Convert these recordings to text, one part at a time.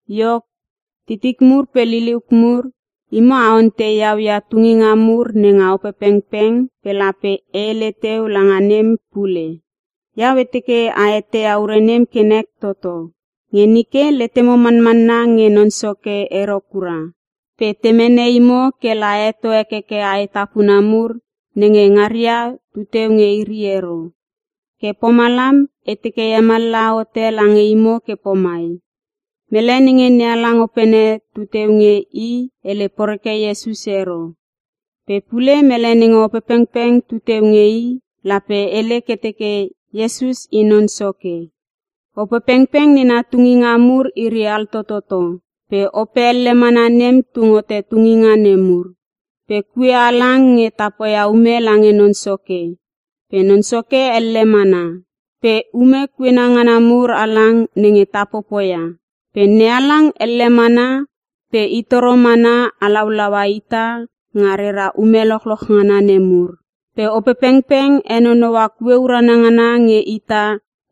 Iok, titik mur pe liliuk mur imo a ontei iau ia tunginga mur nenga Opepengpeng pe lape e hele teu langa nem pule. Iau e teke a eteia ure nem kenek toto. Nge nike letemo manmanna nge Non Soke ero kura pe te mene imo kela a heto hekeke aetapuna mur nenge ngaria tuteu nge iri ero. Ke pomalam e teke e hemallaha hote lange imo ke pomai; Mele nenge NeHalang Opene tuteu nge i hele poreke Iesus ero. Pe pule mele nenge Opepengpeng tuteu nge i, lape hele ke teke Iesus i Non Soke. Opepengpeng nena tunginga mur iri altototo, pe Ope elle mana nem tung hote tunginga nemur. Pe kue halang nge ta poia ume lange Non Soke pe Non Soke elle mana. Pe ume kuena ngana mur halang nenge ta popoia. Pe NeHalang elle mana pe i toro mana halaulaua ita nga rera ume lochloch ngana nemur. Pe Opepengpeng henonoua kue urana ngana nge ita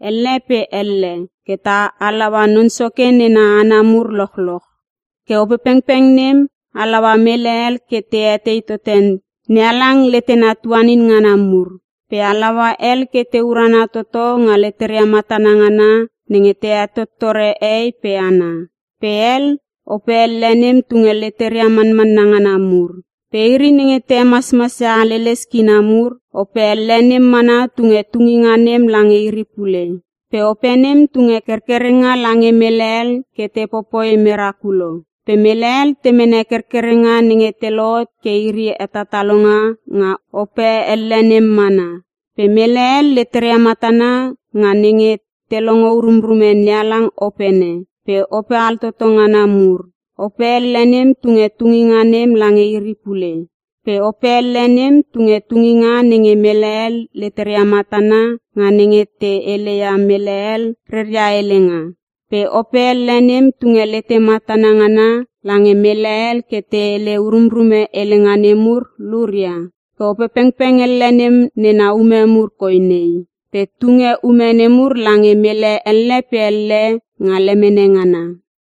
elle pe elle ke ta halaua Non Soke nena hana mur lochloch. Ke Opepengpeng nem halaua mele hel ke te etei tote NeHalang letena tuanin ngana mur. Pe halaua hel ke te urana toto nga leteria matana ngana nenge te hetottore hehei pe hana. Pe hel, Ope elle nem tunge leteria manmanna ngana mur. Pe iri nenge te hemasmasia haleles kina mur, Ope elle nem mana tunge tunginga nem lange iri pule. Pe Ope nem tunge kerkerenga lange mele hel ke te popoi merakulo. Pe mele hel te mene kerkerenga nenge te lohot ke iri hetatalonga nga Ope elle nem mana. Pe mele hel leteria matana nga nenge te longo urumrume NeHalang Opene pe ope altoto ngana mur, Ope elle nem tunge tunginga nem lange iri pule. Pe Ope elle nem tunge tunginga nenge mele hel leteria matana nga nenge te heleia mele hel reria helenga. Pe Ope elle nem tunge lete matana ngana lange mele hel ke te hele urumrume helenga nemur luria. Ke Opepengpeng elle nem nena ume mur koi nei. Pe tunge ume nemur lange mele elle pe elle nga lemene ngana.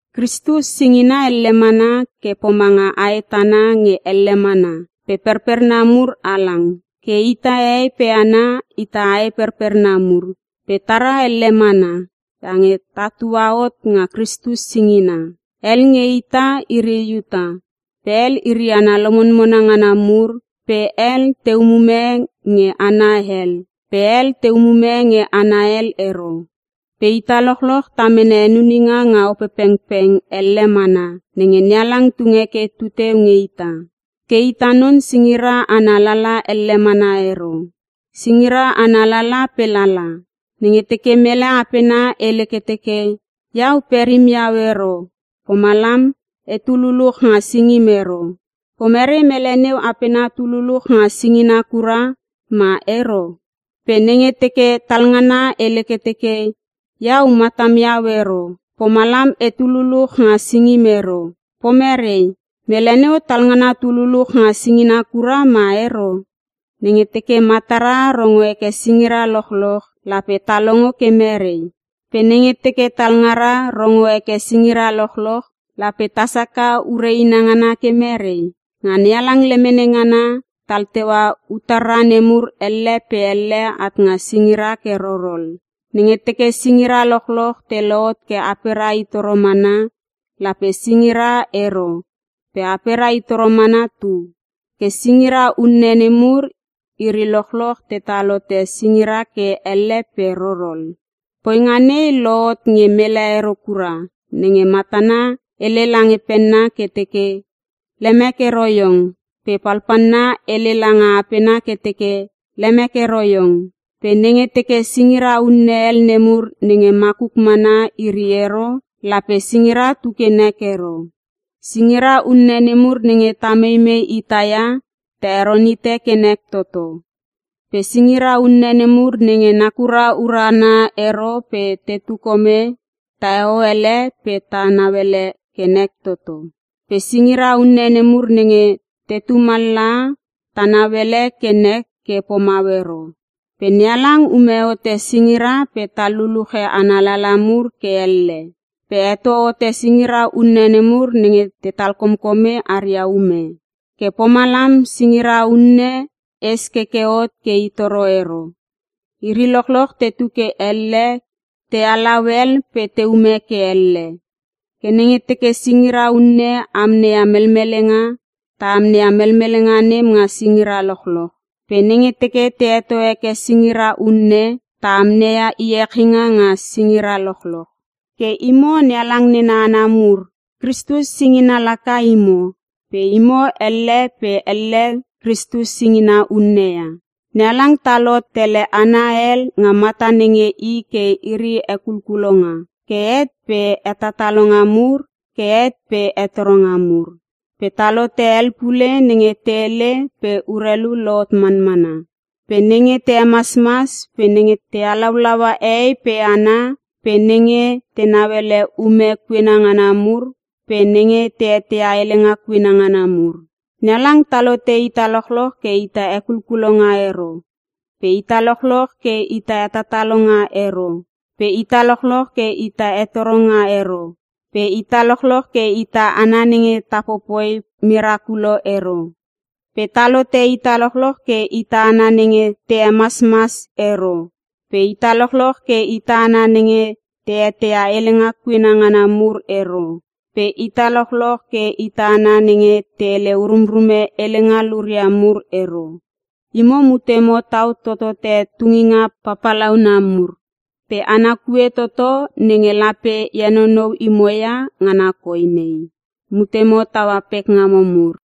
Kristus singina elle mana ke pomanga ae tana nge elle mana pe perperna mur halang. Ke ita hehei pe hana ita ae perperna mur pe tara elle mana iange tatua hot nga Kristus singina. Hel nge ita iri Iuta pe hel iri hana lomonmona ngana mur pe hel te umume nge hana hel pe hel te ume nge hana hel ero. Pe ita lochloch ta mene henuninga nga Opepengpeng elle mana nenge NeHalang tunge ke tu teu nge ita. Ke ita non singira ana lala elle mana ero, singira ana lala pe lala. Nenge teke mele apena hele ke teke, “Iau perim iau ero, pomalam etu luluch nga singim ero.” Pomerei mele neu apena tu luluch nga singina kura ma ero? Pe nenge teke talngana hele ke teke, “Iau matam iau ero, pomalam etu luluch nga singim ero.” Pomerei? Mele neu talngana tu luluch nga singina kura ma ero? Nenge teke matara rongo heke singira lochloch, lape ta longo ke merei? Pe nenge teke talngara rongo heke singira lochloch, lape tasaka ure inangana ke merei? Nga NeHalang lemene ngana tal teua utarra nemur elle pe elle at nga singira ke rorol. Nenge teke singira lochloch te lohot ke apera itoro mana, lape singira ero pe aperia i toro mana tu. Ke singira unne nemur iri lochloch tetal hote singira ke elle pe rorol. Poinga nei lohot nge mele ero kura nenge matana hele langa penna ke teke, “Lemek ero iong.” Pe palpalna hele langa apena ke teke, “Lemek ero iong.” Pe nenge teke singira unne hel nemur nenge makuk mana iri ero, lape singira tu ke nek ero. Singira unne nemur nenge ta meimei ita ia ta heron hite ke nek toto. Pe singira unne nemur nenge nakuria urana ero pe tetu kome taheo ele pe ta nauele ke nek toto. Pe singira unne nemur nenge tetu mallaha ta nauele ke nek ke pomau ero. Pe NeHalang ume hote singira pe tal luluche ana lala mur ke elle. Pe heto hote singira unne nemur nenge te talkomkome aria ume. Ke pomalam singira unne es keke hot ke i toro ero, iri lochloch tetu ke elle ke te halau hel pe te ume ke elle. Ke nenge teke singira unne amneia melmelenga, ta amneia melmelenga nem nga singira lochloch. Pe nenge teke te heto heke singira unne, ta amneia iechinga nga singira lochloch. Ke imo NeHalang nena hana mur, Kristus singina laka imo. Pe imo elle pe elle Kristus singina unne ia. NeHalang tal hot tele hana hel nga mata nenge i ke iri hekulkulonga ke het pe hetatalonga mur ke het pe hetoronga mur. Pe tal hote hel pule nenge te hele pe urelu lohot manmana, pe nenge te hemasmas pe nenge te halaulaua hehei pe hana pe nenge te nauele ume kuena ngana mur pe nenge te eteia helenga kuena ngana mur. NeHalang tal hote ita lochloch ke ita hekulkulonga ero pe ita lochloch ke ita hetatalonga ero pe ita lochloch ke ita hetoronga ero pe ita lochloch ke ita hana nenge ta popoi merakulo ero. Pe tal hote ita lochloch ke ita hana nenge te hemasmas ero pe ita lochloch ke ita hana nenge te eteia helenga kuena ngana mur ero pe ita lochloch ke ita hana nenge te hele urumrume helenga luria mur ero. Imo mutemo tau totote tunginga papalauna mur. Pe ana kue toto nenge lape e henonou imo ia ngana koi nei: Mutemo taua pekngamo mur.